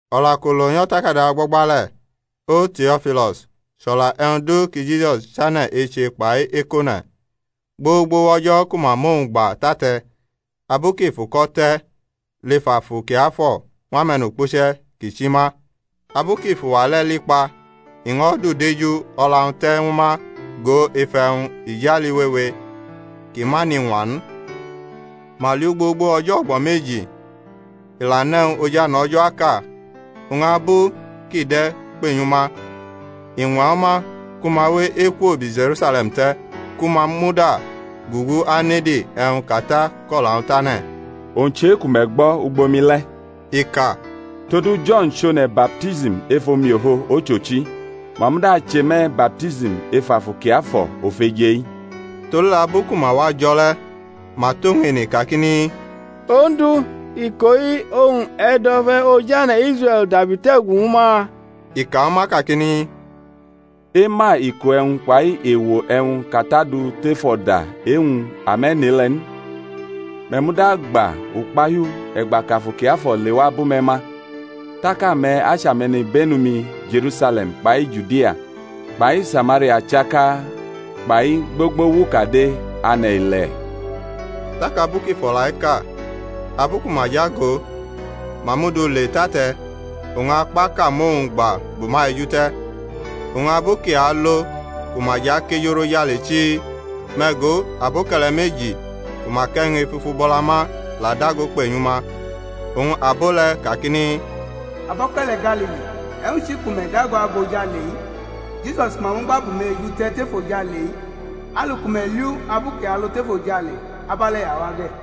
O̩la kʼu lo nyʼo̩takada o̩gbo̩gba le̩, O Teo̩filo̩s, chʼo̩la e̩wñ du ki Jisus chane̩ eche kpai ekʼone̩, gbogbo wʼo̩jo̩ ku ma mʼowñ gba tʼate̩, abu kʼi fʼuko̩ te̩ lef Afu Kiafo̩ ñw ame̩nukpuche̩ kʼi chi ma. Abu kʼi fʼuwa le̩ li kpa i ño̩ dʼudeju o̩la-wñ te̩ ñwu ma go ef e̩wñ ijali wewe ki ma nʼiñwa n. Ma liʼu gbogbo o̩jo̩ o̩gbo̩ meji, i la nʼe̩wñ ojane̩ O̩jo̩ aka. Oñ abu kʼi de̩ kpenyʼuma, i ñwa ñwu ma ku ma we ekwo bi Je̩rusale̩m te̩, ku ma muda gugu anede e̩wñ kʼAta kʼo̩la-wñ tane̩, owñ chʼe-ku me̩ gbo̩ ugbo-mi le̩, i ka. Todu Jo̩n chʼone̩ baptism ef omiofo ochochi; ma muda ache me̩ baptism ef Afu Kiafo̩ ofeje-i. Todule̩ abu ku ma wa jo̩ le̩ ma tʼowñ ene kakini, Ondu, iko-i oñ e̩ dʼo̩fe̩ ojane̩ Israe̩l dabi tʼe̩gu ñwu ma? I ka ñwu ma kakini, Ema iko e̩wñ kpai ewo e̩wñ kʼAta du tef o̩da e-wñ ame̩ nʼe-le̩ n. Me̩ muda agba ukpahiu e̩gba kʼAfu Kiafo̩ lewa bʼume̩ ma, tak ame̩ achʼame̩nibenu-mi Je̩rusale̩m kpai Judia kpai Samaria chaka kpai gbogbo wʼukade ane̩ ile̩. Tak abu kʼi fʼo̩la-i ka, abu ku ma lʼagʼo, ma mʼu du le tʼate̩, oñ akpaʼka mʼowñ gba bʼuma eju te̩. Oñ abu kʼi alo ku ma jʼakejurʼojale chii, me̩ go, aboke̩le̩ meji ku ma kʼe̩wñ efufu bʼo̩la ma la dago kpenyu ma; oñ abo le̩ kakini, Aboke̩le̩ Galili, e̩wñ chi ku me̩ dago ago ojale-i? Jisus ku ma mugba bʼume̩ eju te̩ tef ojale-i, alu ku me̩ liʼu abu kʼi alo tef ojale, abe̩le̩ i awa ge̩.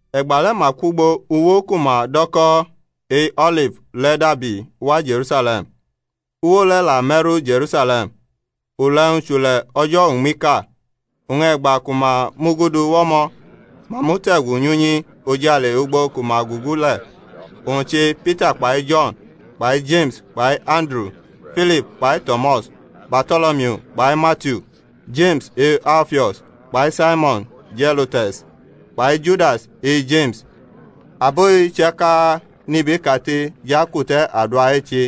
E̩gba le̩ ma kwʼugbo uwo ku ma do̩ ko̩ e-O̩lif le̩ dabi wa Je̩rusale̩m. Uwo le̩ la me̩ru Je̩rusale̩m, ule̩-wñ chʼule̩ o̩jo̩ uñmiʼka. Oñ e̩gba ku ma mʼu gudu wʼo̩mo̩ ma mute̩gu nyʼunyi ojale ugbo ku ma gugu le̩, owñ che Pita kpai Jo̩n kpai Jeme̩s kpai Anduru, Filip kpai Tomas, Barto̩lomiu kpai Matiu, Jeme̩s e-Alfio̩s kpai Saimo̩n Zelo̩tes, kpai Judas e-Jeme̩s. Abo-i chaka nʼibe kate jʼakute̩ adua eche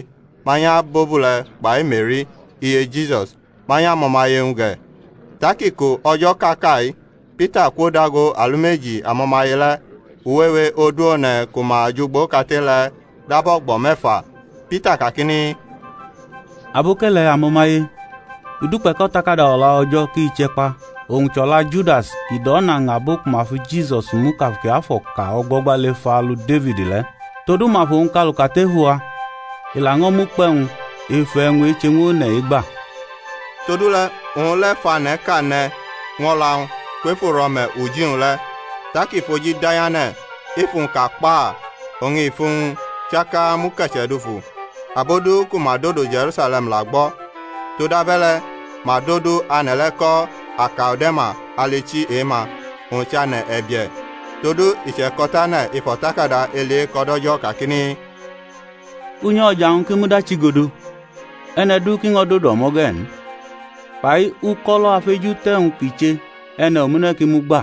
manyʼabobule̩ kpai Meri, iye Jisus, manyʼamo̩maye-wñ ge̩. Tak iko o̩jo̩ kʼa ka-i Pita kwodago alumeji amo̩maye le̩ (uwewe odu one̩ ku ma jʼugbo kate le̩ dab o̩gbo̩ me̩fa) Pita kakini, Abo̩ke̩le̩, amo̩maye, i dukpe̩ kʼO̩takada O̩la O̩jo̩ ki che̩ kpa, owñ chʼo̩la Judas kʼi dʼo̩na ña abo ku ma fi Jisus mu kʼAfu Kiafo̩ ka o̩gbo̩gba lef alu Defid le̩. Todu ma fʼowñ kaluka tʼefu-wa, i laño̩ mʼukpe̩-wñ ef e̩wñ-eche-ñw one̩-i gba. Todule̩ owñ le̩ fʼane̩ʼka ne̩ ñw o̩la-wñ kwef uro̩me̩ uji-wñ le̩; tak i fʼoji da nyʼane̩, efu-wñ ka kpa! oñ ifu-wñ chaka muke̩che̩ dufu. Abo du ku ma dodo Je̩rusale̩m la gbʼo̩: todabe̩le̩ ma dʼodu ane̩ le̩ ko̩ Ake̩ldama alʼichi e-ma, owñ chʼAne̩ E̩bie̩. Todu i che̩ko̩tane̩ ef o̩takada Eli Eko̩ DʼO̩jo̩ kakini, Unyi o̩ja-wñ ki mud achigodo, e̩ne̩ du ki ño̩ dodo o̩mo̩ ge̩ n; kpai, Uko̩lo̩ afejute̩wñ kʼi che, e̩ne̩ omune̩ ki mugba.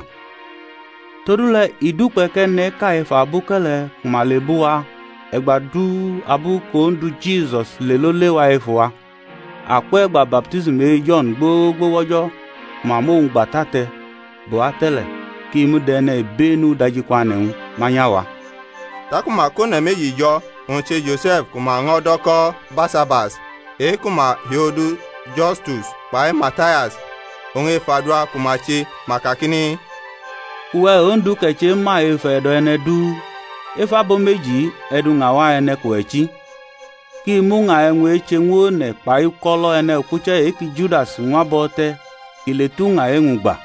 Todule̩ i dukpe̩ kʼe̩ne̩ʼka ef aboke̩le̩ ku ma lebʼuwa e̩gba du abu ki Ondu Jisus lelo lewa efu-wa akwʼe̩gba baptism e-Jo̩n gbogbo wʼo̩jo̩ ku ma mʼowñ gba tʼate̩ bʼuwa te̩ le̩, kʼi mud e̩nibe̩nu udajikwane̩-wñ manyʼawa. Taku ma kʼone̩ meji jo̩, owñ che Jose̩f ku ma ño̩ do̩ ko̩ Barsabas, e-ku ma hiodu Justus, kpai Matias. Oñ ef adua ku ma che ma kakini, Uwe̩, Ondu, kʼe̩ chema ef e̩do̩ e̩ne̩ du, ef abo meji-i e̩ duña wa e̩ne̩ kʼuwe̩ chi, kʼi mʼuña e̩wñ-eche-ñw one̩ kpai uko̩lo̩ e̩nukpuche̩ e-ki Judas ñwa bʼo̩ te̩ kʼi le tʼuña e-wñ gba.